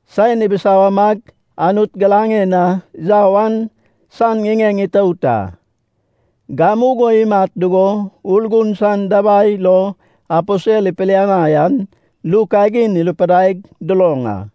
saen ibisawamag Anut giraŋen na yau an san ŋiŋeŋ itout a. Gamugo imat dugo Urgun san dabai lo aposel ipilianai an ru kagin irupidaig duloŋ a.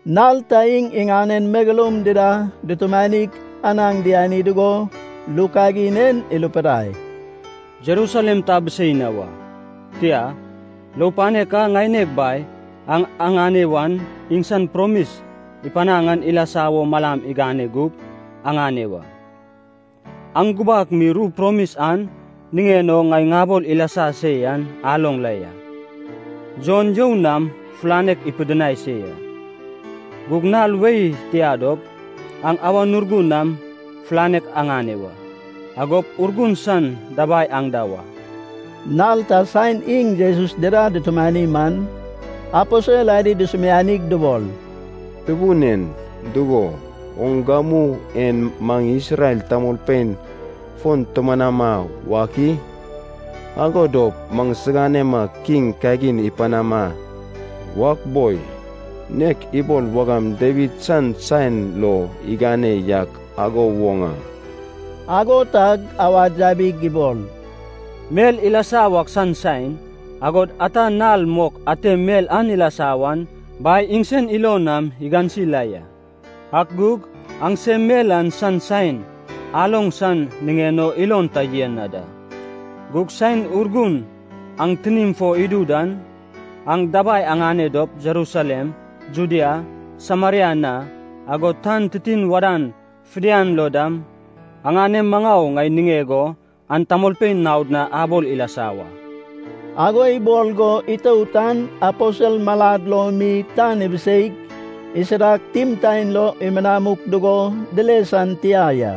Nal ta iŋ iŋanen megeloum dida dutumanig anaŋ diani dugo, ru kagin en irupidai, “Jerusalem ta abisei na wa, tia, lou panek a ŋaineg Bai aŋ aŋane wan iŋsan promis ipanaŋ an ilasa wo malam agane gup aŋane wa. Aŋ gubak mi ru promis an niŋen o ŋai ŋabol ilasa se yan aloŋ la ya. Jon you nam fulanek ipidinai se ya. Gug nal wei tia dop, aŋ Awan Urgun nam fulanek aŋane wa. Agop Urgun san dabai aŋ da wa.” Nal ta saen iŋ Jesus dida dutumani man, aposel adi dusumianig dubol, “Tubun en, dugo, oŋ gamu en maŋ Isrel tamolpein fon tumanama wak i? Ago dop maŋsiganema kiŋ kagin ipanama wak boi, nek ibol wagam Dawid san saen lo igane yak igo woŋ a.” Ago tag awad yabig ibol, “Mel ilasa wak san saen, agod ata nal mok ate mel an ilasa wan Bai iŋsen ilon nam igansi la ya, ak gug aŋsem mel an san saen aloŋ san niŋen o ilon ta yen na da. Gug saen Urgun aŋ tinim fo idu dan, aŋ dabai aŋane dop Jerusalem, Judea, Sameria na, agod tan titin wadan fidian lo dam aŋanem maŋau ŋai niŋeg o an tamolpein naod na abol ilasa wa.” Ago ibol go itout an aposel malad lo mi tan ibiseig, isidag, timtaen lo imianuk dugo dile san tia ya.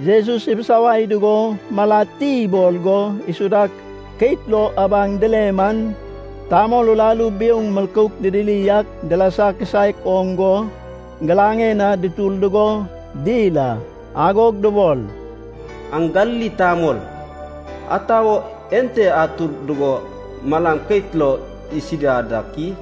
Jesus ibisawai dugo malad ti ibol go isudag keit lo abaŋ dile man, tamol uraru biouŋ milkouk didiri ak dilasa kisaek oŋ go, giraŋed na dutur dugo dil a. Agog dubol, “Aŋ Galili tamol, ata wo ente atur dugo malam keit lo isida dak i?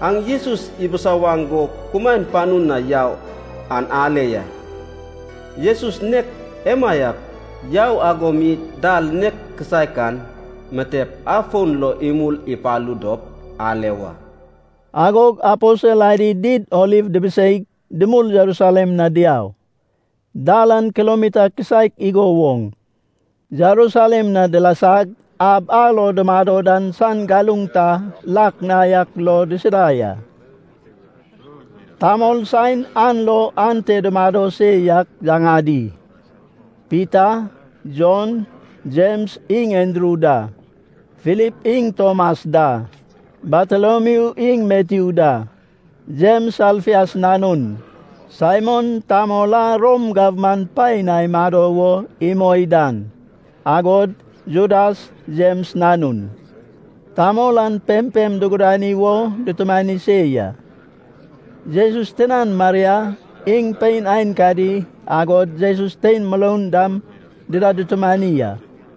Aŋ Jesus ibisawaŋ go kumaen panu na yau an ale ya. Jesus nek emaiak yau ago mi dal nek kisaek an mitep afon lo imul ipalu dop ale wa.” Agog aposel adi Did Oliv dibiseig, dumul Jerusalem na diau. Dal an kilomita kisaek igo woŋ. Jerusalem na dilasag, ab a lo dumado dan san galuŋ ta lak na yak lo disida ya. Tamol saen an lo ante dumado se yak yaŋadi: Pita, Jon, Jems iŋ Andru da, Filip iŋ Tomas da, Bartolomiu iŋ Matyu da, Jems Alfeus nanun, Saimon, tamol a Rom gabman paen na imado wo imoi dan, agod Judas Jems nanun. Tamol an pempem dugudani wo dutumani se ya. Jesus tinan Maria, iŋ pein aenkadi, agod Jesus tein muroun dam dida dutumani a.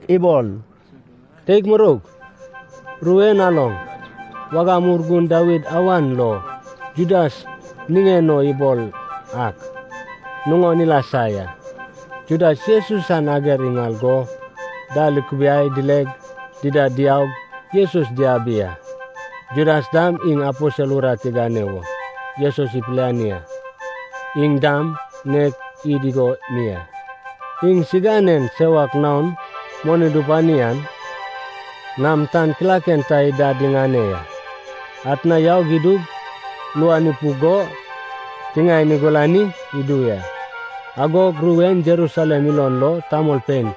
ibol, “Teig muroug, ru en aloŋ, wagam Urgun Dawid awan lo Judas niŋen o ibol ak nuŋon ilasa ya. Judas Jesus san ager iŋal go, dal ikubiai dileg dida diaug Jesus diabi a. Judas dam iŋ aposel urat igane wo Jesus ipiliani a, iŋ dam nek id igo mi a.” (Iŋsiganen sewak naon moni dupani an nam tan kilaken ta idad iŋane ya. Atna yau idug, luan ipuk go tiŋaen igulani idu ya. Agog ru en Jerusalem ilon lo tamolpein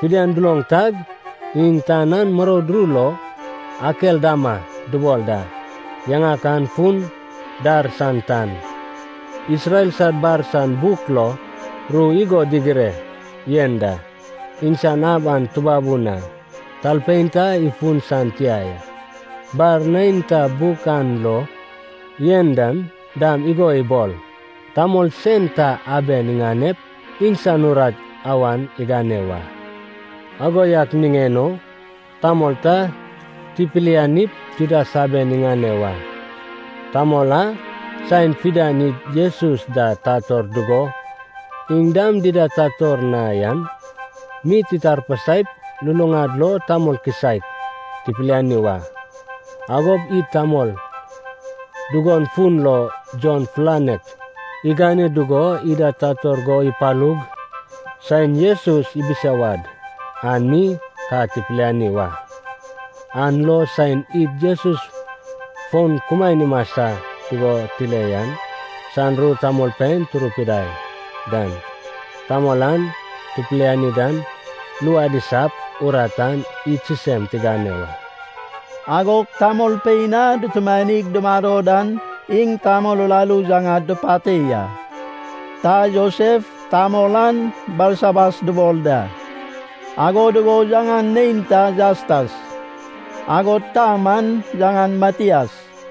fidian duloŋ tag, iŋ tan an muroud ru lo Akeldama dubol da. Yaŋak an fun: dar san tan.) “Isrel sad bar san buk lo ru igo digireg yen da, ‘Iŋsan ab an tubabun a. Talpein ta ifun san tia ya.’ Bar neinta buk an lo yen dan dam igo ibol: ‘Tamol sen ta aben iŋanep, iŋsan urat awan igane wa.’ “Ago yak niŋen o tamol ta tipilianip Judas aben iŋane wa. Tamol a saen fidian id Jesus da tator dugo iŋ dam dida tator na yan mi titarpasaip luluŋad lo tamol kisaek tipiliani wa. Agop id tamol dugon fun lo Jon fulanek igane dugo ida tator go ipalug saen Jesus ibisawad an mi ka tipiliani wa. An lo saen id Jesus fon kumaen imasa dugo tile yan san ru tamolpein turupidai dan, tamol a tupiliani dan luad isap, urat an id sisem tigane wa.” Agog tamolpein a dutumanig dumado dan iŋ tamol uraru yaŋad dupate ya. Ta Josef, tamol an Barsabas dubol da. Ago dugo yaŋan neinta Jastas. Agod ta man yaŋan Mataias.